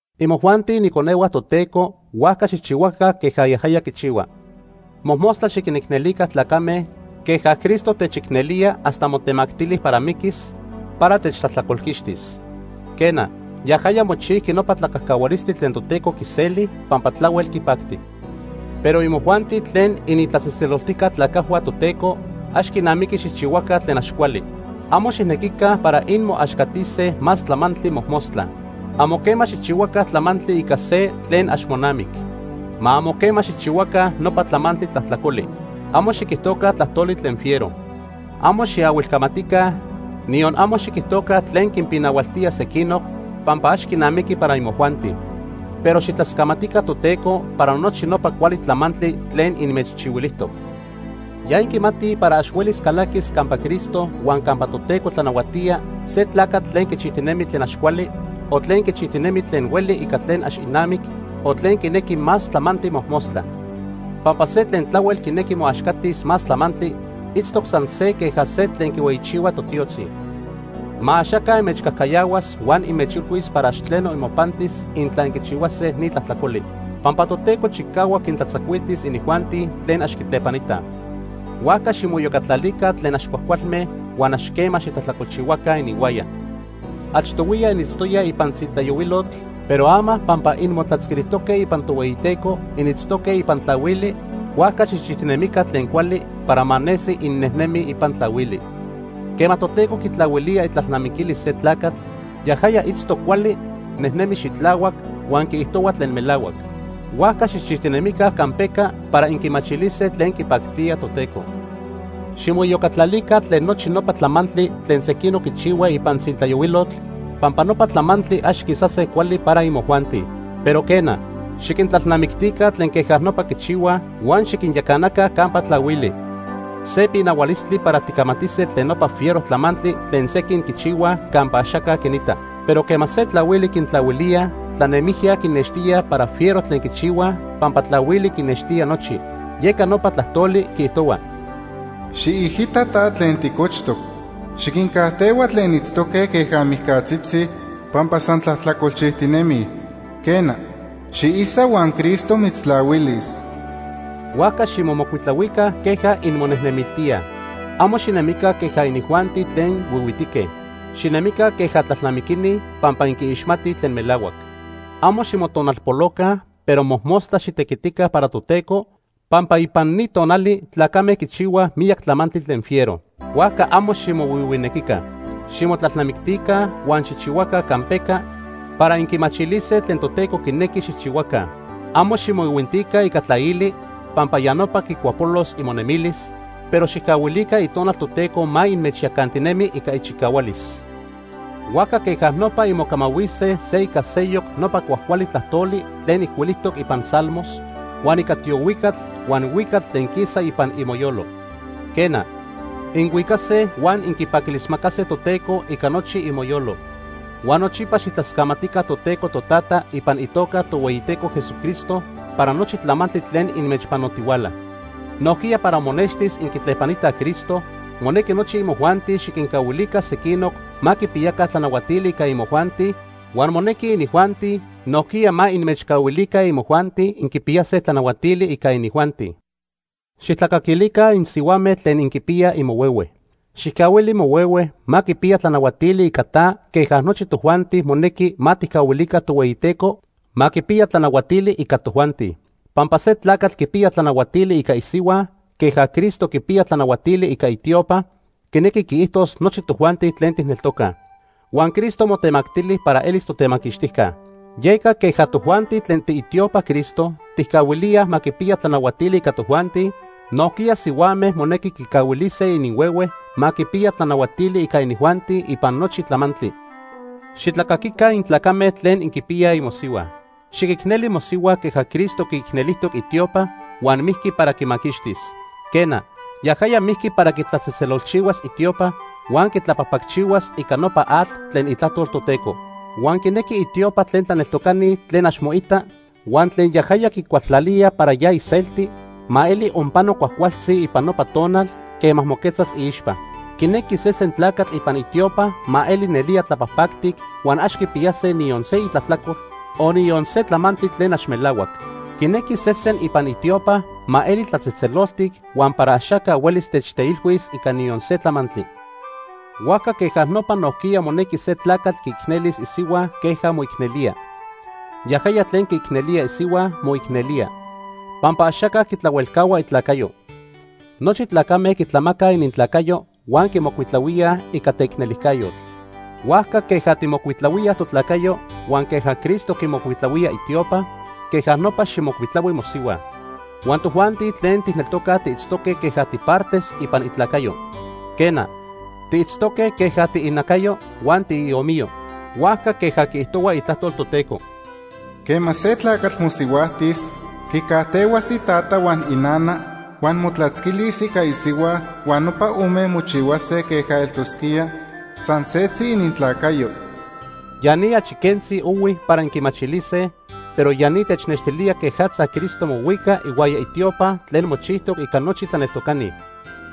Imojuanti iniconehua Toteco, huajca xijchihuaca queja yajaya quichihua. Mojmostla xiquinicnelica tlacame queja Cristo techicnelía hasta motemactili para miquis para techtlajtlacolquixtis. Quena, yajaya mochijqui nopa tlacajcahualistli tlen Toteco quiseli pampa tlahuel quipacti. Pero imojuanti tlen initlatzejtzeloltijca tlacajhua Toteco, ax quinamiqui xijchihuaca tlen ax cuali. Amo xijnequica para inmoaxcatise más tlamantli mojmostla. Amo quema xijchihuaca tlamantli ica se tlen ax monamic. Ma amo quema xijchihuaca nopa tlamantli tlajtlacoli. Amo xiquijtoca tlajtoli tlen fiero. Amo xiahuilcamatica, niyon amo xiquijtoca tlen quinpinahualtía sequinoc pampa ax quinamiqui para imojuanti. Pero xijtlascamatica Toteco para nochi nopa cuali tlamantli tlen inmechchihuilijtoc. Ya inquimatij para ax huelis calaquis campa Cristo huan campa Toteco tlanahuatía se tlacatl tlen quichijtinemi tlen ax cuali, o tlen quichijtinemi tlen hueli ica tlen ax inamic, o tlen quinequi más tlamantli mojmostla. Pampa se tlen tlahuel quinequi moaxcatis más tlamantli, itztoc san se queja se tlen quinhueyichihua totiotzitzi. Ma axaca inmechcajcayahuas huan inmechilhuis para ax tleno imopantis intla inquichihuase ni tlajtlacoli, pampa Toteco chicahuac quintlatzacuiltis inijuanti tlen ax quitlepanitaj. Huajca ximoiyocatlalica tlen ax cuajcualme huan ax quema xitlajtlacolchihuaca ininhuaya. Achtohuiya initztoyaj ipan tzintlayohuilotl, pero ama pampa inmotlatzquilijtoque ipan Tohueyiteco, initztoque ipan tlahuili, huajca xijchijtinemica tlen cuali para ma nesi innejnemij ipan tlahuili. Quema Toteco quitlahuilía itlalnamiquilis se tlacatl, yajaya itztoc cuali, nejnemi xitlahuac, huan quiijtohua tlen melahuac. Huajca xijchijtinemica campeca para inquimachilise tlen quipactía Toteco. Ximoiyocatlalica tlen nochi nopa tlamantli tlen sequinoc quichihuaj ipan tzintlayohuilotl pampa nopa tlamantli ax quisase cuali para imojuanti. Pero quena, xiquintlalnamictica tlen queja nopa quichihuaj huan xiquinyacanaca campa tlahuili. Se pinahualistli para ticamatise tlen nopa fiero tlamantli tlen sequin quichihuaj campa axaca quinita. Pero quema se tlahuili quintlahuilíaj, tlanemijya quinextía para fiero tlen quichihua pampa tlahuili quinextía nochi. Yeca nopa tlajtoli quiijtohua: “Xiijita ta tlen ticochtoc. Xiquincajtehua tlen itztoque queja mijcatzitzi pampa san tlajtlacolchijtinemij. Quena, xiisa huan Cristo mitztlahuilis.” Huajca ximomocuitlahuica queja inmonejnemiltíaj. Amo xinemica queja inijuanti tlen huihuitique. Xinemica queja tlalnamiquini pampa inquiixmatij tlen melahuac. Amo ximotonalpoloca, pero mojmostla xitequitica para Toteco pampa ipan ni tonali tlacame quichihuaj miyac tlamantli tlen fiero. Huajca amo ximohuihuinequica. Ximotlalnamictica huan xijchihuaca campeca para inquimachilise tlen Toteco quinequi xijchihuaca. Amo ximoihuintica ica tlaili pampa ya nopa quicuapolos imonemilis, pero xijcahuilica Itonal Toteco ma inmechyacantinemi ica ichicahualis. Huajca queja nopa inmocamahuise se ica seyoc nopa cuajcuali tlajtoli tlen ijcuilijtoc ipan Salmos, huan ica tiohuicatl huan huicatl tlen quisa ipan imoyolo. Quena, inhuicase huan inquipaquilismacase Toteco ica nochi imoyolo. Huan nochipa xijtlascamatica Toteco Totata ipan itoca Tohueyiteco Jesucristo para nochi tlamantli tlen inmechpanotihuala. Nojquiya para monextis inquitlepanitaj Cristo, monequi nochi imojuanti xiquincahuilica sequinoc ma quipiyaca tlanahuatili ica imojuanti huan monequi inijuanti nojquiya ma inmechcahuilica imojuanti inquipiyase tlanahuatili ica inijuanti. Xijtlacaquilica insihuame tlen inquipiyaj imohuehue. Xijcahuili mohuehue ma quipiya tlanahuatili ica ta queja nochi tojuanti monequi ma tijcahuilica Tohueyiteco ma quipiya tlanahuatili ica tojuanti. Pampa se tlacatl quipiya tlanahuatili ica isihua queja Cristo quipiya tlanahuatili ica itiopa, quinequi quiijtos nochi tojuanti tlen tijneltocaj. Huan Cristo motemactili para elis totemaquixtijca. Yeca queja tojuanti tlen tiitiopaj Cristo tijcahuilíaj ma quipiya tlanahuatili ica tojuanti, nojquiya sihuame monequi quicahuilise ininhuehue ma quipiya tlanahuatili ica inijuanti ipan nochi tlamantli. Xitlacaquica intlacame tlen inquipiyaj imosihua. Xiquicneli mosihua queja Cristo quiicnelijtoc itiopa huan mijqui para quimaquixtis. Quena, yajaya mijqui para quitlatzejtzelolchihuas itiopa huan quitlapajpacchihuas ica nopa atl tlen itlajtol Toteco. Huan quinequi itiopa tlen tlaneltocani tlen ax moita huan tlen yajaya quicualtlalía para ya iselti, ma eli onpano cuajcualtzi ipan nopa tonal quema moquetzas iixpa. Quinequi sesen tlacatl ipan itiopa ma eli nelía tlapajpactic huan ax quipiyase niyon se itlajtlacol, o niyon se tlamantli tlen ax melahuac. Quinequi sesen ipan itiopa ma eli tlatzejtzeloltic huan para axaca huelis techteilhuis ica niyon se tlamantli. Huajca queja nopa nojquiya monequi se tlacatl quiicnelis isihua queja moicnelía. Yajaya tlen quiicnelía isihua, moicnelía. Pampa axaca quitlahuelcahua itlacayo. Nochi tlacame quitlamacaj inintlacayo huan quimocuitlahuíaj ica teicnelijcayotl. Huajca queja tijmocuitlahuíaj totlacayo huan queja Cristo quimocuitlahuía itiopa, queja nopa xijmocuitlahui mosihua. Huan tojuanti tlen tijneltocaj tiitztoque queja tipartes ipan itlacayo. Quena, tiitztoque queja tiinacayo huan tiiomiyo. Huajca queja quiijtohua Itlajtol Toteco: “Quema se tlacatl mosihuajtis, quicajtehuas itata huan inana huan motlatzquilis ica isihua huan nopa ome mochihuase queja eltosquía san setzi inintlacayo.” Ya ni achi quentzi ohui para inquimachilise, pero ya ni technextilía quejatza Cristo mohuica ihuaya itiopa tlen mochijtoc ica nochi tlaneltocani.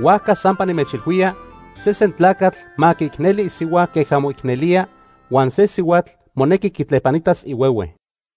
Huajca sampa nimechilhuía, sesen tlacatl ma quiicneli isihua queja moicnelía, huan se sihuatl monequi quitlepanitas ihuehue.